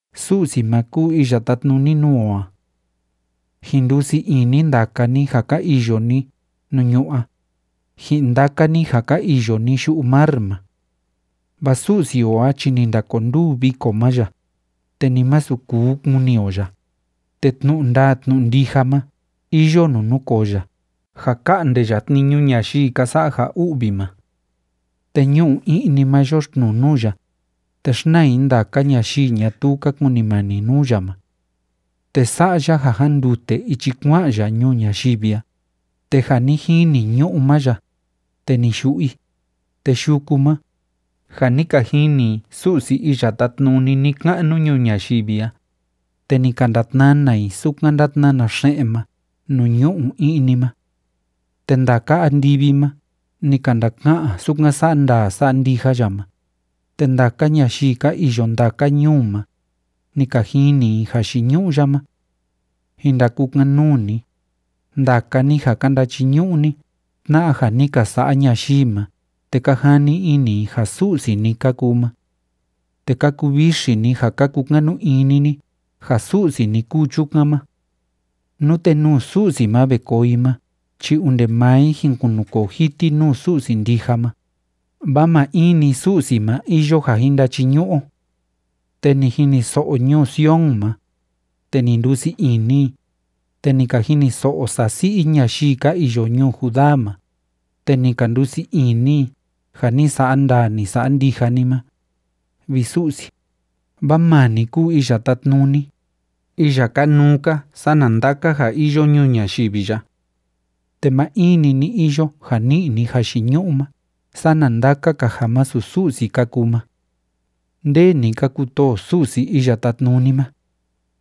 Su'si ma kúu iya tátnuni nuu o a. Jin ndusii ini ndaka ni ja ka iyo ni nuu ñu'ú a, ji'in ndaka ni ja ka iyo ni yu'u mar ma. Vaa Su'si o a chi ni ndakonduu viko ma ya, te ni masu kuu kuni o ya, te tnu'u ndaa tnu'u ndija ma iyo nuu núkoo ya ja ka'nde ya tniñu ñayii ka sa'a ja u'vi ma. Te ñu'u i'ni ma yoxtnuu nuu ya, te xnaa i ndaka ñayii ñatuu ka kunimani nuu ya ma. Te sa'a ya ja jándute ichi kua'an ya ñuu ñayivi a, te ja ni jini ñu'ú ma ya, te ni yu'u i. Te yuku ma, ja ni ka jini i Su'si iya tátnuni ni‑ka'nu ñuu ñayivi a, te ni ka ndatnana i sukan ndátnana xe'en ma nuu ñu'u i'ni ma. Te ndaka andivi ma ni ka ndaka'an sukan sa'a ndaa sa'a ndija ya ma, te ndaka ñayii ka iyo ndaka ñuu ma, ni ka jini i jayiñu'u ya ma. Jin ndakukan‑nuu ni, ndaka ni ja ka ndachiñu'u ni tna'a ja ni ka sa'a ñayii ma te ka jani ini ni ja su'si ni ka kuu ma. Te ka kuvixi ni ja ka kukanu ini ni ja su'si ni kúu chukan ma. Nute nuu Su'si ma ve koo i ma chi onde maa i jin kunukoo jiti nuu Su'si ndija ma, vaa maa in‑ni Su'si ma iyo ja jin ndachiñu'u o. Te ni jiniso'o ñuu Sion ma, te ni ndusii ini i, te ni ka jiniso'o sasi'i ñayii ka iyo ñuu Judá ma, te ni ka ndusii ini i ja ni sa'a ndaa, ni sa'a ndija ni ma, vi Su'si. Vaa maa ni kúu Iya Tátnuni, iya kanuu‑ka sana ndaka ja iyo ñuu ñayivi ya. Te maa in‑ni ni iyo ja ni'i ni jayiñu'u ma sana ndaka‑ka ja masu Su'si ka kuu ma. Ndee ni ka kutoo Su'si Iya Tátnuni ma,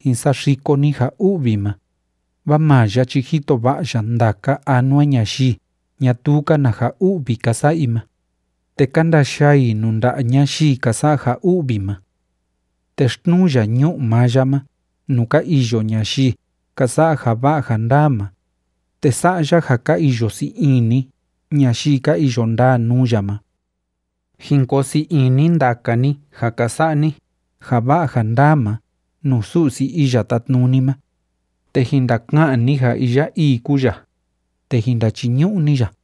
jin saxiko ni ja u'vi ma, vaa maa ya chi jito va'a ya ndaka anua ñayii ñatuu‑ka na ja u'vi ka sa'a i ma, te ka ndayaa i nuu nda'a ñayii ka sa'a ja u'vi ma. Te xtnuu ya ñu'u maa ya ma nuu ka iyo ñayii ka sa'a ja va'a ja ndaa ma, te sa'a ya ja ka iyo sii ini ñayii ka iyo ndaa nuu ya ma. Jin koo sii ini ndaka ni ja ka sa'a ni ja va'a ja ndaa ma nuu Su'si Iya Tátnuni ma, te jin ndaka'an ni ja iya ii kúu ya, te jin ndachiñu'u ni ya.